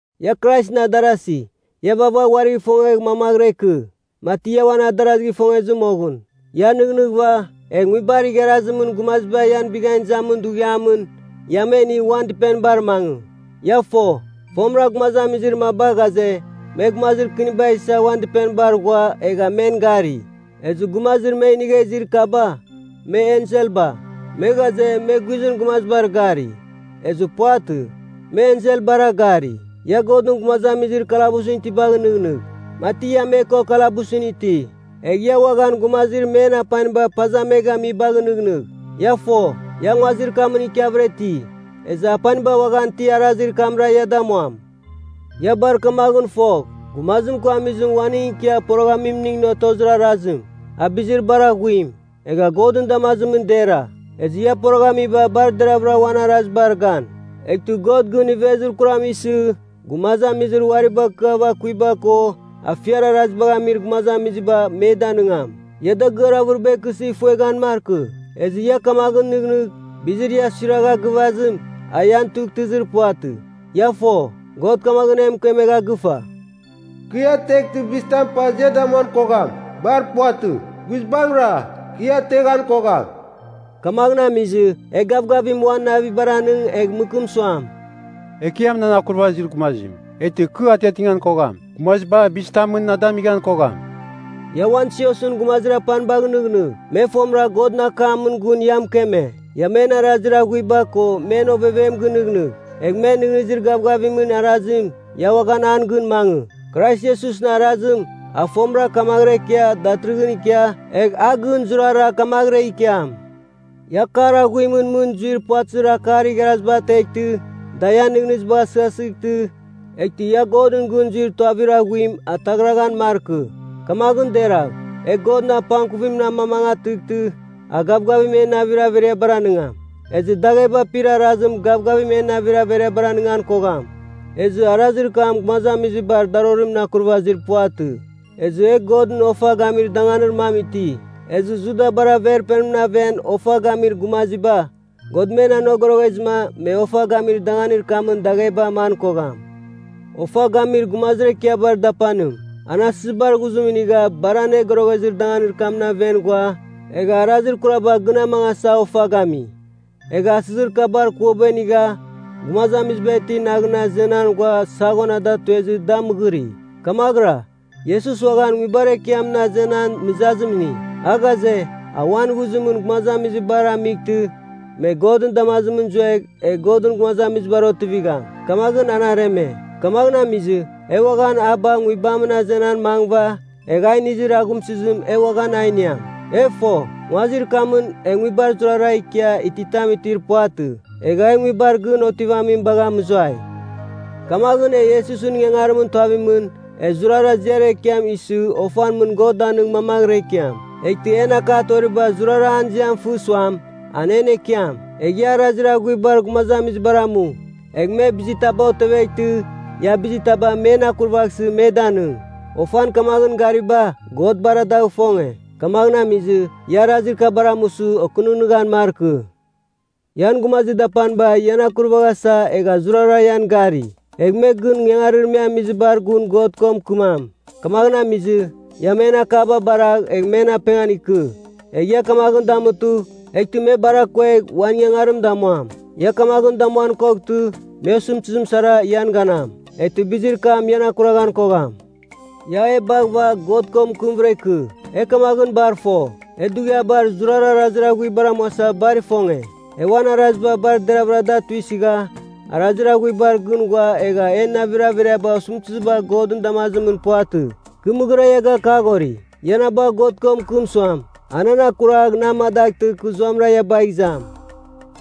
Ia Kraisɨn adarasi, ia vaghvagh uarigh ifongegh mamaghɨra ikɨ, mati ia uan adarazigh ifongezɨ moghɨn. Ia nɨghnɨghɨva, egh nguibar igharazimɨn gumaziba ian bighan izamin dughiamɨn, ia me inigh uan dɨpenibar mangɨ. Ia fo, fomɨra gumazamizir maba ghaze, me gumazir kɨniba isa uan dɨpenibar ghua egha men gari. Ezɨ gumazir me inigha izir kaba, me enselba. Me ghaze, me guizɨn gumazibar gari, ezɨ puvatɨ, me enselbara gari. Ia Godɨn gumazamizir kalabusɨn itibagh nɨghnɨgh, mati ia me ko kalabusɨn iti. Egh ia uaghan gumazir men apaniba paza me gamizibagh nɨghnɨgh. Ia fo, ia nguazir kamɨn ikiavɨra iti, ezɨ apaniba uaghan ti arazir kamra ia damuam. Ia bar kamaghɨn fogh, gumazim ko amizim uaning ikia poroghamimning otozir arazim, a bizir bar aghuim, egha Godɨn damazimɨn dera. Ezɨ ia poroghamiba bar deravɨra uan arazibar gan. Eghtɨ God gɨn ivezir kuram isɨ, gumazamizir uari bakɨava akuiba ko afiar arazibagh amir gumazamiziba, me danɨngam. Ia dagɨar avɨriba ikɨsɨ ifueghan markɨ. Ezɨ ia kamaghɨn nɨghnɨgh, bizir ia suiragha gɨvazim, a ian tughtɨzir puvatɨ. Ia fo, God kamaghɨn e mɨkemegha gɨfa, “Kɨ ia ateghtɨ bizitam paza ia damuan kogham. Bar puvatɨ. Guizbangɨra, kɨ ia ateghan kogham.” Kamaghɨn amizɨ, e gavgavim uan navibar anɨng egh mɨkɨm suam, “Ekiam nan akurvazir gumazim, eghtɨ kɨ atiatighan kogham. Gumaziba bizitamɨn na damighan kogham.” Ia uan siosɨn gumazir apanibagh nɨghnɨgh, me fomɨra Godɨn akamɨn gun ia mɨkeme. Ia men arazir aghuiba ko men ovevem gɨnɨghnɨgh. Egh men nɨghnɨzir gavgavimɨn arazim, ia uaghan an gɨn mangɨ. Krais Iesusɨn arazim a fomɨra kamaghɨra ikia datɨrɨghɨn ikia, egh a gɨn zurara kamaghɨra ikiam. Ia akar aghuimɨn mɨn zuir puvatɨzir akar igharaziba ateghtɨ, da ian nɨghnɨzibagh asɨghasɨghtɨ, eghtɨ ia Godɨn gɨn zuir tuavir aghuim ataghraghan markɨ. Kamaghɨn deragh, e Godɨn apangkuvim amamangatɨghtɨ a gavgavim en navir averiabar anɨngam. Ezɨ dagheba apir arazim gavgavim en navir averiabar anɨngan kogham. Ezɨ arazir kam gumazamizibar darorimɨn akurvazir puvatɨ. Ezɨ e Godɨn ofa gamir danganir mam iti. Ezɨ Judabar Averpenimɨn aven ofa gamizir gumaziba, God me anogoroghezɨma, me ofa gamir danganir kamɨn dagheba aman kogham. Ofa gamir gumazir ekiabar dapanim, an asɨzibar ghuzim inigha Bar Anogoroghezir Danganir kamɨn aven ghua, egha arazir kuraba gɨn amangasa ofa gami. Egha asɨzir kabar kuaba inigha gumazamiziba itir naghɨn azenan ghua saghon a da tuezɨ da mɨgɨri. Kamaghɨra, Iesus uaghan nguibar ekiamɨn azenan mɨzazim ini. A ghaze, a uan ghuzimɨn gumazamizibar amightɨ me Godɨn damazimɨn zuegh egh Godɨn gumazamizibar otivigham, kamaghɨn an areme. Kamaghɨn amizɨ, e uaghan a bagh nguibamɨn azenan mangɨva, egh a inizir aghumsɨzim e uaghan a iniam. E fo, nguazir kamɨn e nguibar zurara ikia ititam itir puvatɨ. Egha e nguibar gɨn otivamim bagha mɨzuai. Kamaghɨn, e Iesusɨn ingangarimɨn tuavimɨn, e zurara ziar ekiam isɨ ofan mɨn God danɨng mamaghɨra ikiam. Eghtɨ en akar toriba zurara an ziam fɨ suam, an en Ekiam. Egh ia arazir aghuibar gumazamizibar amu. Egh me bizir taba oteveghtɨ ia bizir taba men akurvaghsɨ me danɨng. Ofan kamaghɨn gariba, God bar dagh ifonge. Kamaghɨn amizɨ, ia arazir kabar amusɨ okɨnɨghnɨghan markɨ. Ian gumazir dapaniba ian akurvasa egha zurara ian gari. Egh me gɨn ingangarir me amizibar gun God ko mɨkɨmam. Kamaghɨn amizɨ, ia men akaba baragh egh men apengan ikɨ. Egh ia kamaghɨn damutɨ, eghtɨ me bar akuegh uan ingangarim damuam. Ia kamaghɨn damuan koghtɨ, me osɨmtɨzim sara ian ganam, eghtɨ bizir kam ian akuraghan kogham. Ia e baghɨva God ko mɨkɨmvɨra ikɨ. E kamaghɨn bar fo, e dughiabar zurara arazir aghuibara amuasa bar ifonge. E uan araziba bar deravɨra da tuisɨgha arazir aghuibar gɨn ghua egha en navir averiaba osɨmtɨziba Godɨn damazimɨn puvatɨ. Kɨ mɨghɨra ia gakaghori, ia na bagh God ko mɨkɨm suam, a nan akuragh na amadaghtɨ kɨ zuamɨra ia bagh izam.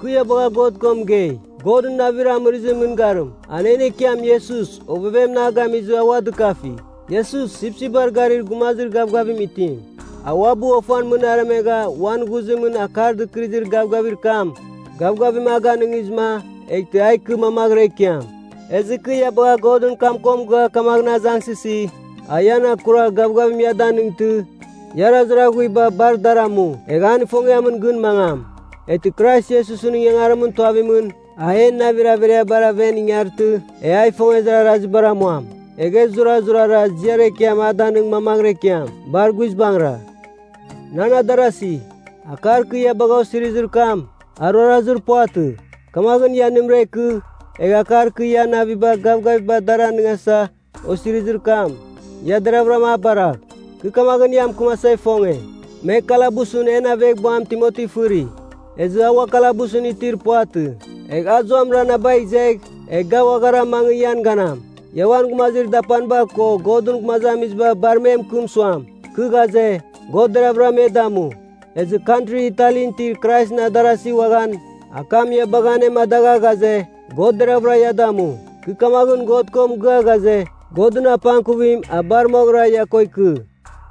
Kɨ ia bagha God ko mɨgei, Godɨn Navir Amɨrɨzimɨn Mɨngarim, a en Ekiam Iesus ovevemɨn a gamizɨ a ua dɨkafi. Iesus, Sipsipbar Garir Gumazir Gavgavim Itim, a uabɨ ofan mɨn aremegha uan ghuzimɨn Akar Dɨkɨrɨzir Gavgavir kam, gavgavim a ganɨngizɨma, eghtɨ a ikɨ mamaghɨra ikiam. Ezɨ kɨ ia bagha Godɨn kam ko mɨgɨa kamaghɨn azangsɨsi, a ian akuragh gavgavim ia danɨngtɨ, ia arazir aghuiba bar dar amu, egh an ifongiamɨn gɨn mangam. Eghtɨ Krais Iesusɨn ingangarimɨn tuavimɨn, a en navir averiabar aven ingartɨ, e a ifongezir arazibar amuam. Egh e zurazurara ziar ekiam a danɨng mamaghɨra ikiam. Bar guizbangɨra. Nan adarasi, akar kɨ ia bagha osirizir kam, a ruarazir puvatɨ. Kamaghɨn, ia nɨmɨra ikɨ, egh akar kɨ ia naviba gavgaviba a dar anɨngasa osirizir kam, ia deravɨram a baragh. Kɨ kamaghɨn ia mɨkɨmasa ifonge, me kalabusɨn en aveghbuam Timoti fɨri, ezɨ a ua kalabusɨn itir puvatɨ. Egh a zuamɨra na bagh izegh, egh ga uaghara mangɨ ian ganam. Ia uan gumazir dapaniba ko Godɨn gumazamiziba bar me mɨkɨm suam, kɨ ghaze, God deraghvɨra me damu. Ezɨ Kantri Italin itir Kraisɨn adarasi uaghan akam ia bagha anemadagha ghaze, God deraghvɨra ia damu. Kɨ kamaghɨn God ko mɨgɨa ghaze, Godɨn apangkuvim a bar moghɨra ia ko ikɨ.